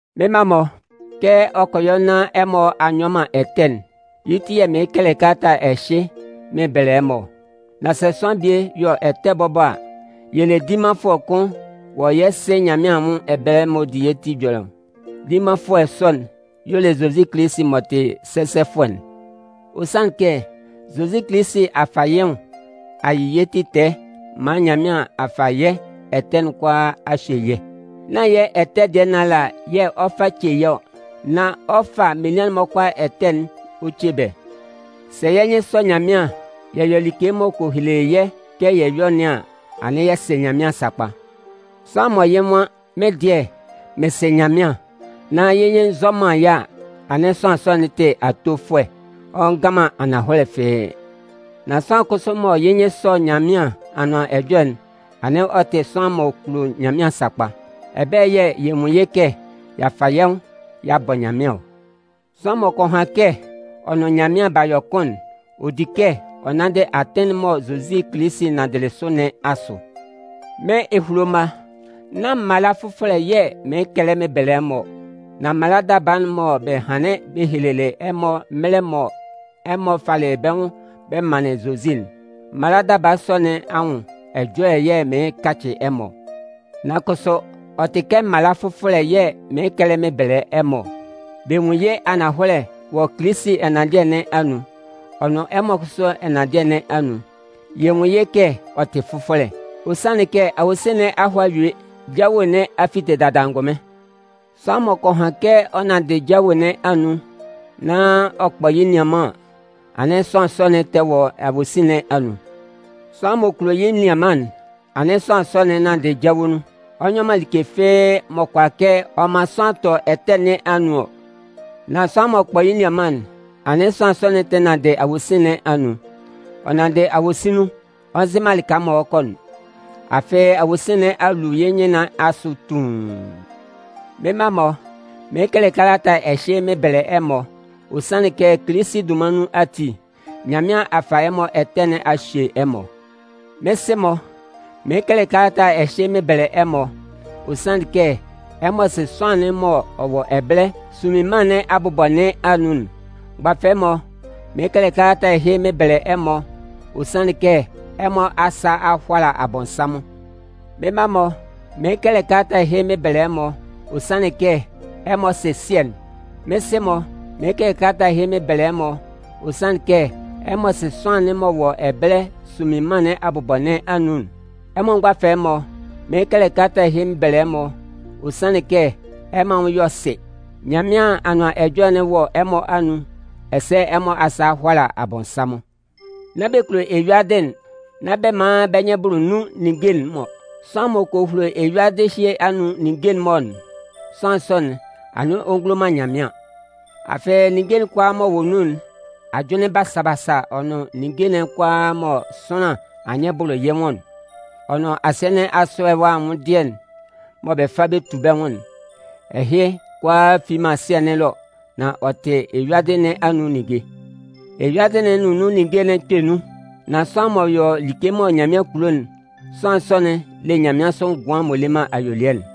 Mɩ́n mma-mɔ, kɛ ɔ kɔ yɔ nán ɛmɔ a nyɔ man ɛtɛ'n, yɩ́ ti yɛ̂ mɩɩn kɛlɛ kalata ɛhɩ mɩn bɛlɛ ɛmɔ ɔ. Nan sɛ sʋanlan bie yɔ ɛtɛ bɔbɔ a, yɛ le dimanfʋɛ kʋn wɔ yɛ́ Sɩ Nyanmɩan anwʋn ɛbɛlɛ m'ɔ di yɛ́ ti ɛjɔlɛ ɔ. Dimanfʋɛ sɔ'n, y'ɔ le Zozi Kilisi m'ɔ tɩ sɛsɛfʋɛ'n. Ɔ sanlɩn kɛ Zozi Kilisi a fa yɩ́ nwʋn a yɩ yɛ́ ti tɛɛ maan Nyanmɩan a fa yɛ́ ɛtɛ'n kʋalaa a hye yɛ́. Nán yɛ́ ɛtɛ dɩɛ nɩn ala yɛ̂ ɔ 'fa ce yɛ́ ɔ, nan ɔ 'fa menian'n-mɔ kʋalaa ɛtɛ'n ɔ ce bɛ́. Sɛ yɛ́ nyɩn sɔ Nyanmɩan, yɛ yɔ like m'ɔ kɔ hele yɛ́ kɛ yɛ yɔ́ nɩn an, anɩn yɛ sɩ Nyanmɩan sakpa. Sʋanlan mɔ yɩ́ nwan: “Mɩ́n dɩɛ, mɩn sɩ Nyanmɩan,” nán yɩ́ nyɩn nzɔ man yɩ́ a, anɩn sʋanlan sɔ'n tɩ atofʋɛ, ɔ ngan man ananhɔlɛ fɩ́ɩ́. Nan sʋanlan kʋsʋ mɔ yɩ́ nyɩn sɔ Nyanmɩan Anʋan Ɛjɔlɛ'n, anɩn ɔ tɩ sʋanlan m'ɔ kulo Nyanmɩan sakpa. Ɛbɛlɛ yɛ̂ yɛ nwun yɩ́ kɛ y'a fa yɛ́ nwʋn y'a bɔ Nyanmɩan ɔ. Sʋanlan m'ɔ kɔ han kɛ ɔ nʋn Nyanmɩan b'a yɔ kʋn'n, ɔ di kɛ ɔ nanndɩ atɩn'n mɔ Zozi Kilisi nanndɩlɩ sʋ nɩn asʋ. Mɩ́n ehulo mma, nán mala fʋfɔlɛ yɛ̂ mɩɩn kɛlɛ mɩn bɛlɛ ɛmɔ ɔ. Nan mala daba'n mɔ bɛ hanlɩn bɛ helelɩ ɛmɔ mɛlɛ mɔ ɛmɔ falɩ bɛ́ nwʋn bɛ manlɩn Zozi'n. Mala daba sɔ nɩn anwʋn ɛjɔlɛ yɛ̂ mɩɩn kacɩ ɛmɔ ɔ. Nan kʋsʋ, ɔ tɩ kɛ mala fʋfɔlɛ yɛ̂ mɩɩn kɛlɛ mɩn bɛlɛ ɛmɔ ɔ. Bɛ nwun yɩ́ ananhɔlɛ wɔ Kilisi ɛnanndɩɛ nɩn anun, ɔ nʋn ɛmɔ kʋsʋ ɛnanndɩɛ nɩn anun. Yɛ nwun yɩ́ kɛ ɔ tɩ fʋfɔlɛ, ɔ sanlɩn kɛ awosin nɩn a hɔ a yue, jawe nɩn a fite dada angʋnmɩn. Sʋanlan m'ɔ kɔ han kɛ ɔ nanndɩ jawe nɩn anun nan ɔ kpɔ yɩ́ nianman an, anɩn sʋanlan sɔ'n tɛ nanndɩ awosin nɩn anun. Sʋanlan m'ɔ kulo yɩ́ nianman'n, anɩn sʋanlan sɔ'n nanndɩ jawe nun. Ɔ nyɔ man like fɩ́ɩ́ m'ɔ kʋala kɛ ɔ man sʋanlan tɔ ɛtɛ nɩn anun ɔ. Nan sʋanlan m'ɔ kpɔ yɩ́ nianman'n, anɩn sʋanlan sɔ'n tɛ nanndɩ awosin nɩn anun. Ɔ nanndɩ awosin nun, ɔ nzɩ man lɩka m'ɔ lɛ kɔ'n. Afɩ awosin nɩn a lu yɩ́ nyɩn nɩn asʋ tuun. Mɩ́n mma-mɔ, mɩɩn kɛlɛ kalata ɛhɩ mɩn bɛlɛ ɛmɔ, ɔ sanlɩn kɛ Kilisi dunman nun ati, Nyanmɩan a fa ɛmɔ ɛtɛ nɩn a hye ɛmɔ. Mɩ́n sɩ-mɔ, mɩɩn kɛlɛ kalata ɛhɩ mɩn bɛlɛ ɛmɔ, ɔ sanlɩn kɛ ɛmɔ sɩ sʋanlan'n m'ɔ wɔ ɛbɛlɛ sunmin mân nɩn abʋbɔ nɩn anun'n. Mgbafɛlɛ-mɔ, mɩɩn kɛlɛ kalata ɛhɩ mɩn bɛlɛ ɛmɔ, ɔ sanlɩn kɛ ɛmɔ asa a hʋala Abɔnsanmʋn. Mɩ́n mma-mɔ, mɩɩn kɛlɛ ɛhɩ mɩn bɛlɛ ɛmɔ, ɔ sanlɩn kɛ ɛmɔ sɩ Sɩɛ'n. Mɩ́n sɩ-mɔ, mɩɩn kɛlɛ kalata ɛhɩ mɩn bɛlɛ ɛmɔ, ɔ sanlɩn kɛ ɛmɔ sɩ sʋanlan'n m'ɔ wɔ ɛbɛlɛ sunmin mân nɩn abʋbɔ nɩn anun'n. Ɛmɔ mgbafɛlɛ'n-mɔ, mɩɩn kɛlɛ kalata ɛhɩ mɩn bɛlɛ ɛmɔ, ɔ sanlɩn kɛ ɛmɔ anwʋn yɔ sɩ. Nyanmɩan Anʋan Ɛjɔlɛ'n wɔ ɛmɔ anun, ɛsɛ ɛmɔ asa a hʋala Abɔnsanmʋn. Nán bɛ kulo eyuadɩ'n, nán bɛ man bɛ́ nyɩn bʋlʋ nun ninnge'n-mɔ. Sʋanlan m'ɔ kɔ hulo eyuadɩ ɛhɩ anun ninnge'n-mɔ'n, sʋanlan sɔ'n, anɩn ɔ ngulo man Nyanmɩan. Afɩ ninnge'n kʋalaa m'ɔ wɔ nun'n, ajʋnlɩn basa-basa, ɔ nʋn ninnge'n kʋalaa mɔ sʋanlan anyɩn bʋlʋ yɩ́ nwʋn'n, ɔ nʋn asɩɛ nɩn asʋ ɛwa anwʋndɩɛ'n mɔ bɛ fa bɛ tu bɛ́ nwʋn'n, ɛhɩ kʋalaa fi man Sɩɛ nɩn ɛlɔ, nan ɔ tɩ eyuadɩ nɩn anun ninnge. Eyuadɩ'n nʋn nun anyɩnbʋlʋ'n 'kpɛ nun, nan sʋanlan m'ɔ yɔ like mɔ Nyanmɩan kulo'n, sʋanlan sɔ'n le nyanmɩansʋ ngʋan'n m'ɔ le man ayuelɩɛ'n.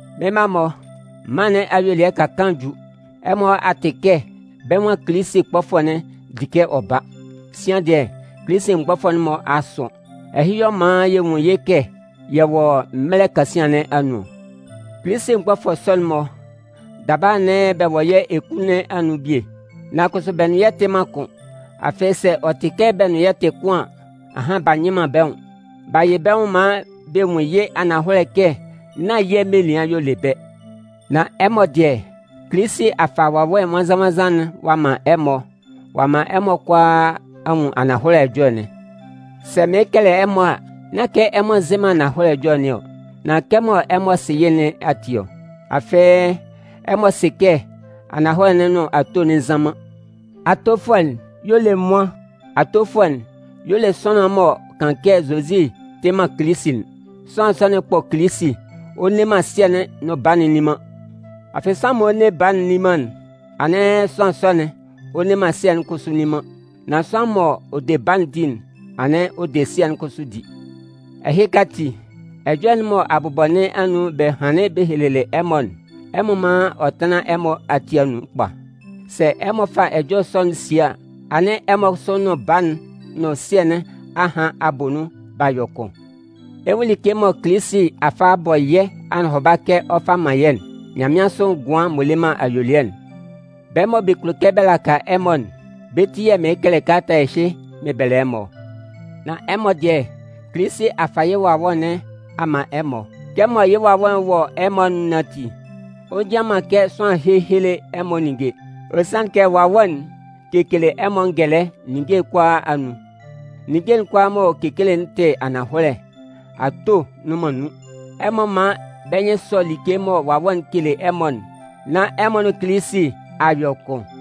Mɩ́n mma-mɔ, mân nɩn ayuelɩɛ ka kaan ju. Ɛmɔ a tɩ kɛ bɛ́ nwan Kilisi kpɔfʋɛ'n di kɛ ɔ ba. Sian dɩɛ, Kilisi mgbɔfʋɛ'n-mɔ a sʋn. Ɛhɩ y'ɔ man yɛ nwun yɩ́ kɛ yɛ wɔ mɛlɛ kasian nɩn anun ɔ. Kilisi mgbɔfʋɛ sɔ'n-mɔ, daba anɩn bɛ wɔ yɛ́ eku nɩn anun bie, nan kʋsʋ bɛ nʋn yɛ́ tɩ man kʋn. Afɩ sɛ ɔ tɩ kɛ bɛ nʋn yɛ́ tɩ kʋn an, ahan b'a nyɩ man bɛ́ nwʋn. B'a yɩ bɛ́ nwʋn maan bɛ nwun yɩ́ ananhɔlɛ kɛ nán yɛ́ menian y'ɔ le bɛ́. Nan ɛmɔ dɩɛ, Kilisi a fa Wawɛ Nwannzan-nwannzan'n ɔ'a man ɛmɔ, ɔ'a man ɛmɔ kʋalaa a nwun ananhɔlɛ ɛjɔlɛ'n. Sɛ mɩɩn kɛlɛ ɛmɔ a, nán kɛ ɛmɔ nzɩ man ananhɔlɛ ɛjɔlɛ nɩn ɔ, nan kɛmɔ ɛmɔ sɩ yɩ́ nɩn ati ɔ. Afɩ, ɛmɔ sɩ kɛ ananhɔlɛ'n nʋn ato'n bɛ nzan man. Atofʋɛ'n y'ɔ le nwan? Atofʋɛ'n y'ɔ le sʋanlan'n m'ɔ kan kɛ Zozi tɩ man Kilisi'n. Sʋanlan sɔ'n kpɔ Kilisi. Ɔ nne man Sɩɛ'n nʋn Baa'n nni man. Afɩ, sʋanlan m'ɔ nne Baa'n nni man'n, anɩn sʋanlan sɔ'n, ɔ nne man Sɩɛ'n kʋsʋ nni man. Nan sʋanlan m'ɔ de Baa'n di'n, anɩn ɔ de Sɩɛ'n kʋsʋ di. Ɛhɩka ati, ɛjɔlɛ'n mɔ abʋbɔ nɩn anun bɛ hanlɩn bɛ helelɩ ɛmɔ'n, ɛmɔ mán ɔ tánlan ɛmɔ ati anun kpa. Sɛ ɛmɔ fa ɛjɔlɛ sɔ'n sie a, anɩn ɛmɔ kʋsʋ nʋn Baa'n nʋn Sɩɛ nɩn a han a bɔ nun b'a yɔ kʋn. Ɛ 'nwun like mɔ Kilisi a fa a bɔ yɛ́ anɔhʋba kɛ ɔ 'fa man yɛ́'n: nyanmɩansʋ ngʋan'n m'ɔ le man ayuelɩɛ'n. Bɛ́ mɔ bɛ kulo kɛ bɛ laka ɛmɔ'n, bɛ́ ti yɛ̂ mɩɩn kɛlɛ kalata ɛhɩ mɩn bɛlɛ ɛmɔ ɔ. Nan ɛmɔ dɩɛ, Kilisi a fa yɩ́ Wawɛ nɩn a man ɛmɔ. Kɛmɔ yɩ́ Wawɛ'n wɔ ɛmɔ anun nɩn ati, ɔ njian man kɛ sʋanlan héhele ɛmɔ ninnge. Ɔ sanlɩn kɛ Wawɛ'n kekele ɛmɔ ngɛlɛ ninnge kʋalaa anun. Ninnge'n kʋalaa m'ɔ kele'n tɩ ananhɔlɛ, ato nnʋn man nun. Ɛmɔ mán bɛ́ nyɩn sɔ́ like mɔ Wawɛ'n kele ɛmɔ'n nán ɛmɔ nʋn Kilisi a yɔ kʋn.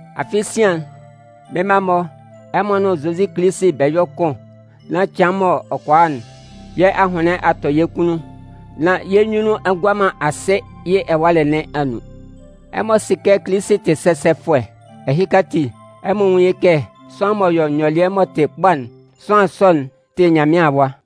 Afɩ sian, mɩ́n mma-mɔ, ɛmɔ nʋn Zozi Kilisi bɛ yɔ́ kʋn nán cɩan m'ɔ kɔ a'n, yɛ́ ahʋnlɩn a tɔ yɛ́ kunnun, nán yɛ́ nyunnun a ngua man asɩ yɩ́ ɛwalɛ nɩn anun. Ɛmɔ sɩ kɛ Kilisi tɩ sɛsɛfʋɛ, ɛhɩka ati, ɛmɔ nwún yɩ́ kɛ sʋanlan m'ɔ yɔ nyɔlɩɛ m'ɔ tɩ kpa'n, sʋanlan sɔ'n tɩ Nyanmɩan awa.